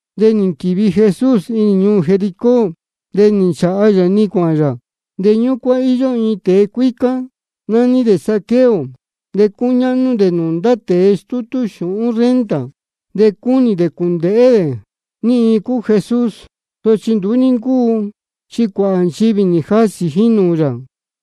De nī nquīvi Jesús inī ñuū Jericó, de nī nchāha yā-ni cuāhān yā. De ñúcuán íyó iin tēe cuícá, nání dē Zaqueo, de cúñáhnú dē nūū ndá tēe stútú xūhún renta. De cúnī dē cūndēhé dē ní iin cúu Jesús. Sochi nduú ní ncúu, chi cuāhā nchivī nī jasī ji nūū yā,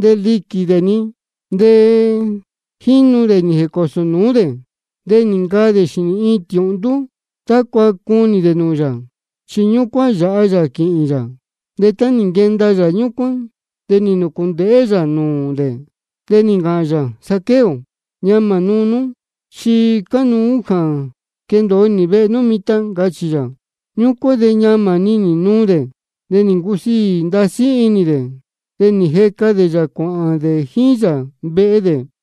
de liquī dē-ni. De jínu dē nī jēcōsō nūú dē. De nī ncaa dē xīnī iin tiūhndú tácua cunī dē nūū yā, chi ñúcuán yāha yā quīhīn yā. De tá nī nquenda yā ñúcuán, de nī nūcūndēhé yā nūū dē, de nī ncāhān yā: Zaqueo, ñamā nuu nú, chi cánuú jā quendōo nī vehe nú mitan, ncachī yā. Ñúcuán de ñamā-ni nī nuu dē, de nī ncusiī ndasí inī dē, de nī jeca dē yā cuāhān dē jíín yā vehe dē.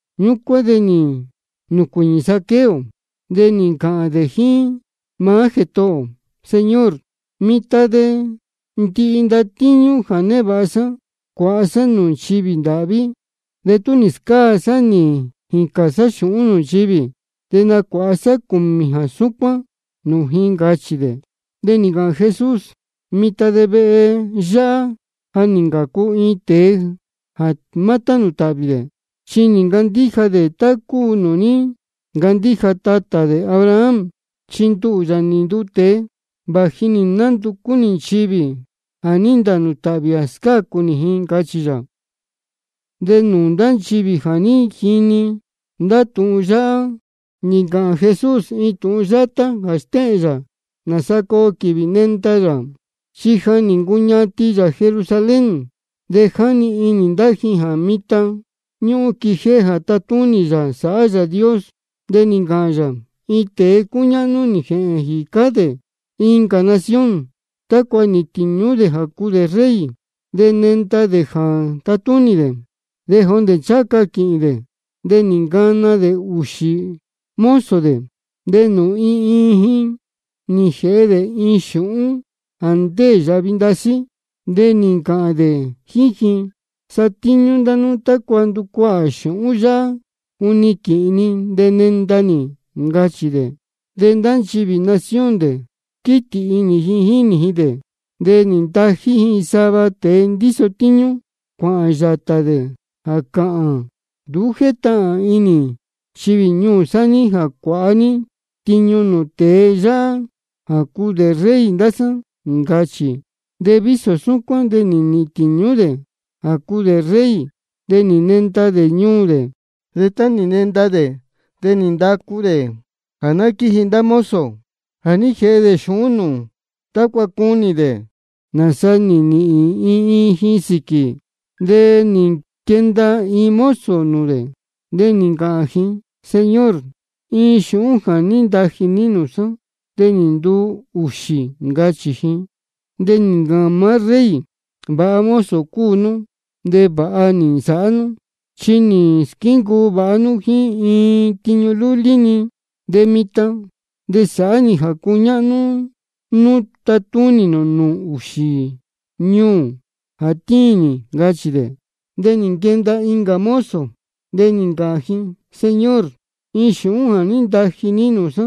Ñúcuán de nī nūcuīñī Zaqueo, de nī ncāhān dē jíín maá Jētohō ō: Señor, mitan de ndihi ndatíñú jā névāha sá, cuāha sá sava nūū nchivī ndāhví, de tú nī scáa cā sá nī jīcān sá xūhún nūū nchivī, de nacuāha sá cūmī jā súcuán nūū ji, ncachī dē. De nī ncāhān Jesús: Mitan de vehe yáhá ja nī ncācu iin tēe jā má tánū tāhvī dē, chi nī ncandíja dē tá cúu nūū ní ncandíja tatā dē Abraham. Chi nduhū, Yāā nī nduu tēe, vāji nī nánducú nī nchivī jā ní ntānū tāhvī, de scácu nī ji, ncachī yā. De nūū ndá nchivī jā ní jini ndá tūhun yáhá nī ncāhān Jesús iin tūhun yátá jā stéhēn yā nāsa coo quīvī nenda yā. Chi ja nī ncuñatin yā Jerusalén, de jáni inī ndá ji jā mitan ñúhún quijéhé jā tatúnī yā sāhá Yāā Dios. De nī ncāhān yā: Iin tēe cúñáhnú nī jēhēn jīcá dē incā nación, tácua nīhīn tīñú dē jā cuu dē rey, de nenda dē jā tatúnī dē. De jondē ncháha ca quīhīn dē, de nī ncana dē ūxī mozo dē, de nūū iin iin ji nī jēhe dē iin xūhún jā ndéē yāhvi ndasí. De nī ncāhān dē jíín ji: Satíñú ndá nú tácua nducuahā xūhún yáhá juni quīhīn ni de nenda nī, ncachī dē. De ndá nchivī nación dē, quítī inī ji jínī ji dē, de nī ntají ji sava tēe ndíso tíñú, cuāhān yātā dē jā cāhān: Nduú jétahān inī nchivī ñuū sá jā cuāha ní tiñu nūū tēe yáhá jā cuu dē rey ndá sá, ncachī. De vísō súcuán de nī nīhīn tīñú dē jā cuu dē rey, de nī nenda dē ñuū dē. De tá nī nenda dē de nī ndacu dē jā ná quíji ndá mozo jā ní jēhe dē xūhún nūū, tácua cunī dē nāsaa nī nīhīn iin iin ji sīquī. De nī nquenda iin mozo nūū dē, de nī ncāhān ji: Señor, iin xūhún jā ní ntaji ní nūū sá, nī nduu ūxī, ncachī ji. De nī ncāhān maá rey: Vāha mozo cúu nú, de vāha nī nsāhá nú. Chi nī squíncuu vāha nú jíín iin tiñu lúlí-ni, de mitan de sāhá nī jā cuñáhnú nú tatúnī nū nūū ūxī ñuū jā tíin nī, ncachī dē. De nī nquenda incā mozo, de nī ncāhān ji: Señor, iin xūhún jā ní ntaji ní nūū sá,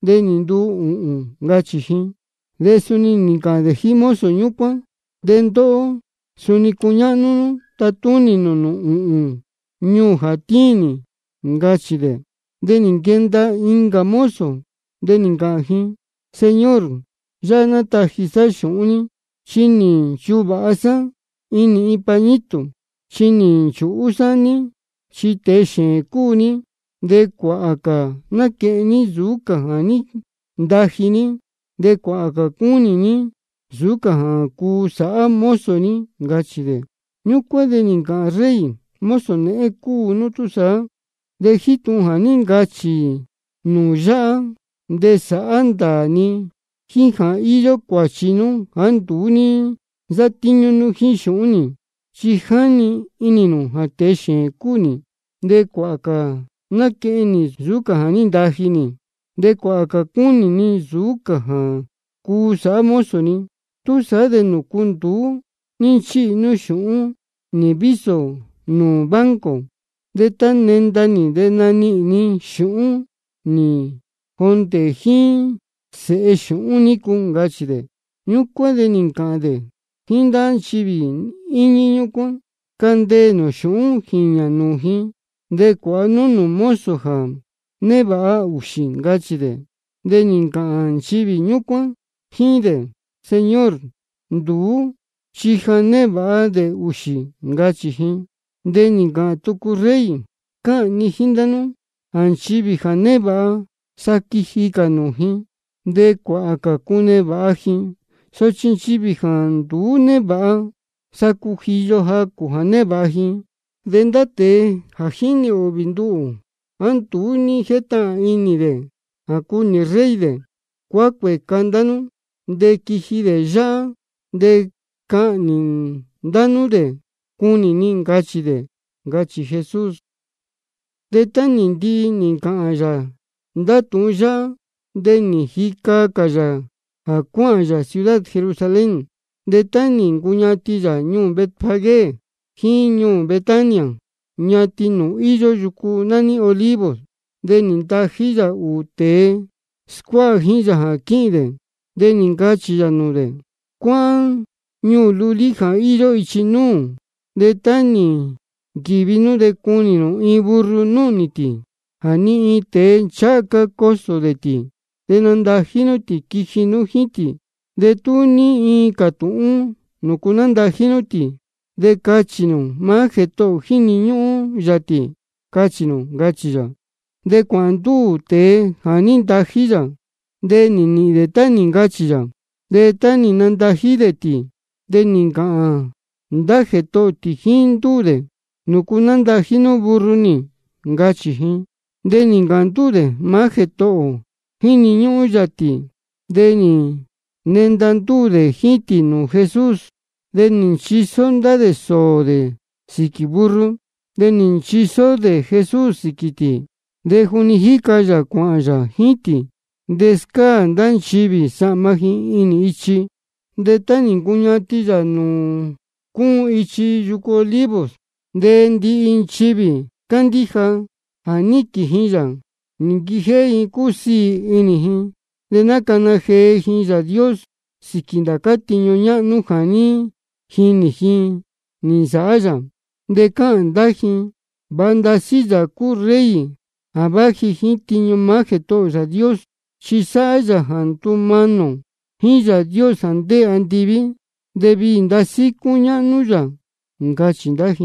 nī nduu ūhūn, ncachī ji. De suni nī ncāhān dē jíín mozo ñúcuán: De ndóhó, suni cuñáhnú nú tatúnī nū nūū ūhūn ñuū jā tíin nī, ncachī dē. De nī nquenda incā mozo, de nī ncāhān ji: Señor, yáhá nataji sá xūhún ní, chi nī nchuvāha sá inī iin pañito. Chi nī nchūhú sá ní, chi tēe xēēn cúu ní. Chi cuāhā cā náquehen ní nsūú cā jā ní ntaji ní, de cuāhā cā cúnī ní nsūú cā jā cuu sāhá mozo ní, ncachī dē. Ñúcuán de nī ncāhān rey: Mozo nēhén cúu nú túsaá, de jíín tūhun jā ní ncachī nū yáhá de sāhá ndāā ni jā íyó cuāchi nú jāá nduú ní nsátíñú nú jíín xūhún nī. Chi jáni inī nū jā tēe xēēn cúu nī, de cuāhā cā náquehen nī nsūú cā jā ní ntaji nī, de cuāhā cā cúnī ni nsūú cā jā cuu sāhá mozo ni. ¿Túsaá de nūcu nduú ní nchíhi nú xūhún nī vísō nūū banco? De tá nenda nī de nanihīn ni xūhún nī jondē jíín sēhe xūhún nícu, ncachī dē. Ñúcuán de nī ncāhān dē jíín ndá nchivī íñí ñúcuán: Candeē nū xūhún jīñā nūū ji, de cuāha nú nūū mozo ja névāha ūxī, ncachī dē. De nī ncāhān nchivī ñúcuán jíín dē: Señor, nduú chi ja névāha dē ūxī, ncachī ji. De nī ncāhān tucu rey: Cáhān ni jíín ndá nú jā nchivī ja névāha, sa quiji cā nūū ji, de cuāhā cā cunevāha ji. Sochi nchivī jāá nduú névāha, sa cujiyo-ni jacū jā névāha ji. De ndá tēe jā jínī ūhvī nduhū, jāá nduú ní jétahān inī dē jā cuu nī rey dē, cuácuēca ndá nú dē quiji dē yáhá. De cahnī nū ndá dē cunī ni, ncachī dē, ncachī Jesús. De tá nī ndihi nī ncāhān yā ndá tūhun yáhá, de nī jica cā yā jā cuáhān yā ciudad Jerusalén. De tá nī ncuñatin yā ñuū Betfagé jíín ñuū Betania, ñatin nūū íyó yucu nání Olivos, de nī ntají yā ūū tēe scuáha jíín yā jā quíhīn dē. De nī ncachī yā nūū dē: Cuáhán ñuū lulí jā íyó ichi núū. De tá nī nquīvi nú de cunī nū iin burro núhnī tī, jā ni iin tēe ncháha ca cosō dē tī. De nandají nú tī quiji nú jíín tī. De tú ní iin cātūhún nūcu nándají nú tī, de cachī nū: Maá Jētohō ō jíni ñúhún yā tī, cachī nū, ncachī yā. De cuāhān ndúū tēe jā ní ntají yā, de nī nīhīn dē tá nī ncachī yā. De tá nándají dē tī, de nī ncāhān ndá jētohō tī jíín ndúū dē: ¿Nūcu nándají nú burro nī? ncachī ji. De nī ncāhān ndúū dē: Maá Jētohō ō jíni ñúhún yā tī. De nī nenda ndúū dē jíín tī nūū Jesús. De nī nchisó ndá dē sōō dē sīquī burro, de nī nchisó dē Jesús sīquī tī. De juni jíca yā cuāhān yā jíín tī, de scáā ndá nchivī sahma ji inī ichi. De tá nī ncuñatin yā nūū cúun ichi yucu Olivos, de ndihi nchivī cándíja jā níquīn ji yā, nī nquijéhé ji cúsiī inī ji, de nácana jee ji Yāā Dios sīquī ndācá tiñu ñáhnú jā ní jinī ji nī nsāhá yā. De cáhān ndá ji: Vāha ndasí Yāā cúu Rey jā váji jíín tiñu maá Jētohō ō Yāā Dios. Chi sáhá yā jā ndúmanī ō jíín Yāā Dios jā ndéē andiví, de viī ndasí cúñáhnú Yāā Dios, ncachī ndá ji.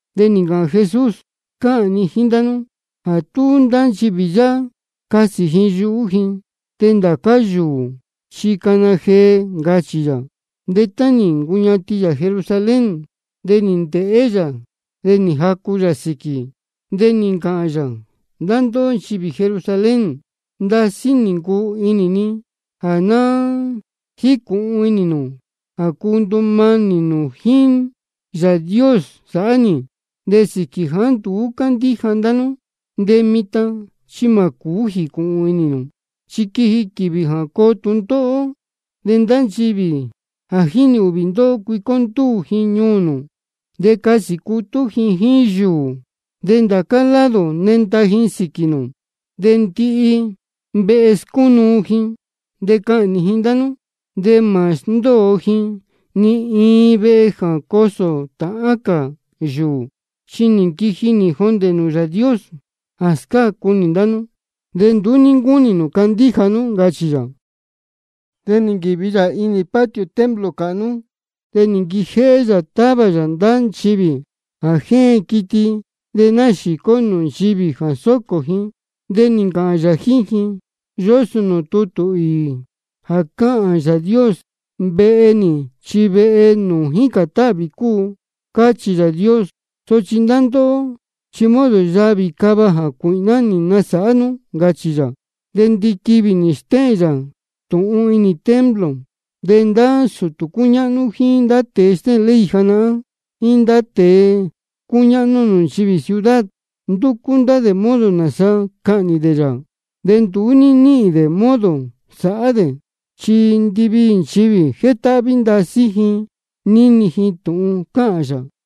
De nī ncāhān Jesús: Cáhān ni jíín ndá nú jā tú ndá nchivī yáhá casī ji yuhú ji, de ndācá yūū chi cana jee, ncachī yā. De tá nī ncuñatin yā Jerusalén, de nī ndēhé yā, de nī jacu yā sīquī. De nī ncāhān yā: Ndá ndóhó nchivī Jerusalén, ndasí nī ncuu inī ni jā ná jícūhun inī nū jā cuu ndumanī nū jíín Yāā Dios sāhá nī. De sīquī jāá nduú cándíja ndá nú, de mitan chi mā cūú jīcūhun inī nū. Chi quiji quīvī jā coo tūndóhó, de ndá nchivī jā jínī ūhvī ndóhó, cuicó ndúū ji ñuū nū, de casī cutú ji jíín yūū, de ndācá lado nenda ji sīquī nū. De ndihi vehe scúnúu ji, de cahnī ji ndá nú. De mā sndóo ji ni iin vehe jā cosō tāhán cā yūū. Chi nī nquiji nī jondē nūū Yāā Dios jā scácu nī ndá nú, de nduú ní ncándíja nú, ncachī yā. De nī nquīvi yā inī patio templo cāhnú, de nī nquijéhé yā távā yā ndá nchivī jā jéen quiti de náxīcó nūū nchivī jā sōcō ji. De nī ncāhān yā jíín ji: Yósō nūū tutū īī jā cáhān Yāā Dios: Vehe nī chi vehe nūū jícān táhvī cúu, cáchī Yāā Dios. Sochi ndá ndóhó chi modo yavī cava jācuīhná nī nasāhá nú, ncachī yā. De ndiquivī nī stéhēn yā tūhun inī templo. De ndá sūtū cúñáhnú jíín ndá tēe stéhēn ley janahán jíín ndá tēe cúñáhnú nūū nchivī ciudad, ndúcú ndá dē modo nāsa cahnī dē yā. De nduú ní níhīn dē modo sāhá dē, chi ndiviī nchivī jétáhví ndasí ji níni ji tūhun cáhān yā.